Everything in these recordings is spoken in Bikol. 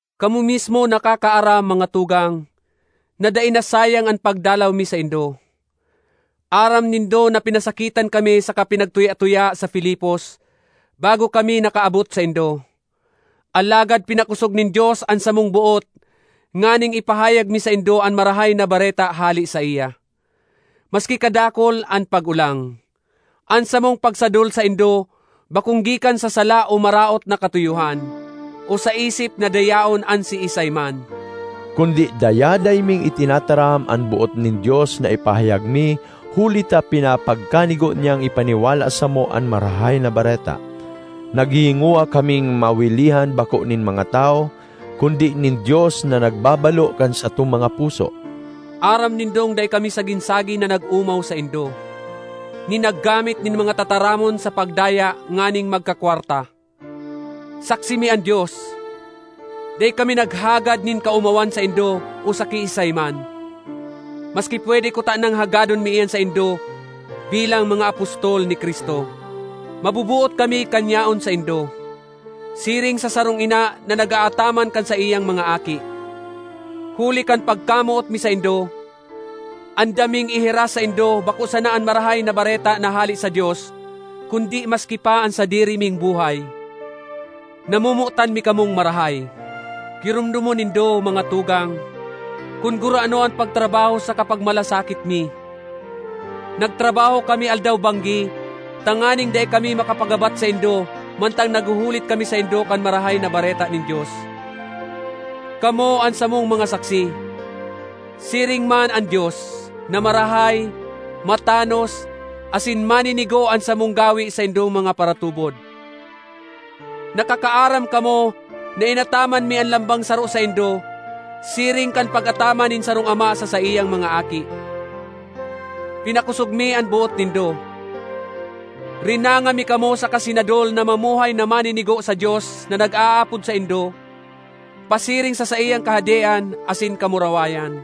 Kamo mismo nakakaaram, mga tugang, na dai nasayang an pagdalaw mi saindo. Aram nindo na pinasakitan kami saka pinagtuya-tuya sa Filipos bago kami nakaabot saindo. Alagad pinakosog nin Dios an samong boot nganing ipahayag mi saindo an Marahay na Bareta hale saiya, maski kadakul an pag-olang. An samong pagsadol saindo bakong gikan sa sala o maraot na katuyohan, o sa isip na dayaon an siisay man. Kundi dayaday ming itinataram an boot nin Dios na ipahayag mi huli ta pinapagkanigo niyang ipaniwala samo an Marahay na Bareta. Naghihingowa kaming mawilihan bako nin mga tawo kundi nin Dios na nagbabalo kan satong mga puso. Aram nindong dai kami sagin-sagin na nag-omaw saindo, ni naggamit nin mga tataramon sa pagdaya nganing magkakwarta. Saksi mi an Dios! Dai kami naghagad nin kaomawan saindo o sa kiisay man, maski pwede kutanang hagadon mi iyan saindo bilang mga apostol ni Cristo. Maboboot kami kan yaon saindo, siring sa sarong ina na nag-aataman kan saiyang mga aki. Huli kan pagkamoot mi saindo, andam ming ihiras saindo bako sana an Marahay na Bareta na hale sa Dios kundi maski pa an sadiri ming buhay. Namomotan mi kamong marahay! Giromdomon nindo, mga tugang, kun gurano an pagtrabaho saka pagmalasakit mi! Nagtrabaho kami aldaw-banggi tanganing dai kami makapagabat saindo mantang naghuhulit kami saindo kan Marahay na Bareta nin Dios. Kamo an samong mga saksi, siring man an Dios, na marahay, matanos, asin maninigo an samong gawe saindong mga paratubod. Nakakaaram kamo na inataman mi an lambang saro saindo siring kan pag-ataman nin sarong ama sa saiyang mga aki. Pinakosog mi an boot nindo, rinanga mi kamo saka sinadol na mamuhay na maninigo sa Dios na nag-aapod saindo pasiring sa saiyang Kahadean asin kamurawayan.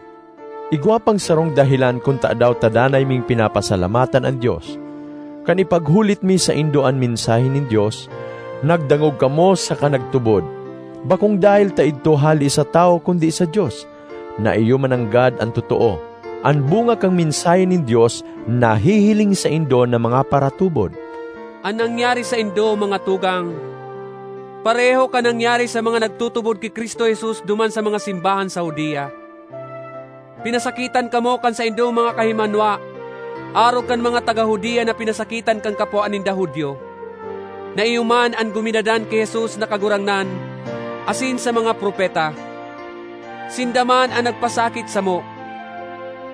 Igwa pang sarong dahelan kun tadaw ta danay ming pinapasalamatan an Dios; kan ipaghulit mi saindo an mensahe nin Dios, nagdangog kamo saka nagtubod, bakong dahel ta idto hale sa tawo kundi sa Dios, na iyo mananggad an totoo. An bunga kan mensahe nin Dios nahihiling saindo na mga paratubod. An nangyari saindo, mga tugang, pareho kan nangyari sa mga nagtutubod ki Cristo Jesus duman sa mga simbahan sa Judea. Pinasakitan kamo kan saindong mga kahimanwa arog kan mga taga Judea na pinasakitan kan kapwa ninda Judio, na iyo man an guminadan ki Jesus na Kagurangnan asin sa mga propeta. Sinda man an nagpasakit samo.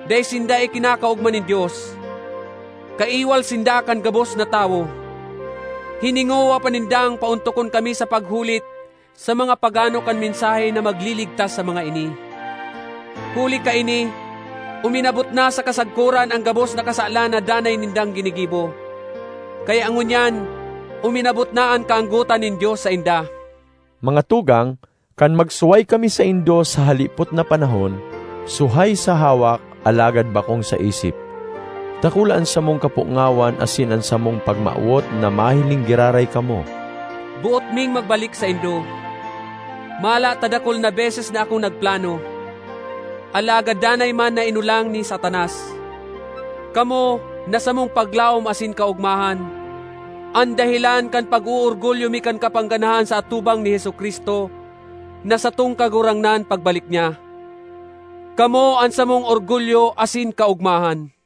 Dai sinda ikinakaogma nin Dios; kaiwal sinda kan gabos na tawo! Hiningowa pa nindang paontokon kami sa paghulit sa mga pagano kan mensahe na magliligtas sa mga ini. Huli kaini uminabot na sa kasagkoran an gabos na kasalan na danay nindang ginigibo. Kaya ngunyan uminabot na an kaanggotan nin Dios sainda. Mga tugang, kan magsuhay kami saindo sa halipot na panahon—suhay sa hawak alagad bakong sa isip—dakula an samong kapongawan asin an samong pagmawot na mahiling giraray kamo! Boot ming magbalik saindo. Mala ta dakul na beses na akong nagplano, alagad danay man na inolang ni Satanas. Kamo, na samong paglaom asin kaogmahan, an dahelan kan pag-oorgulyo mi kan kapangganahan sa atubang ni Jesu-Cristo na satong Kagurangnan pagbalik niya. Kamo an samong orgulyo asin kaogmahan!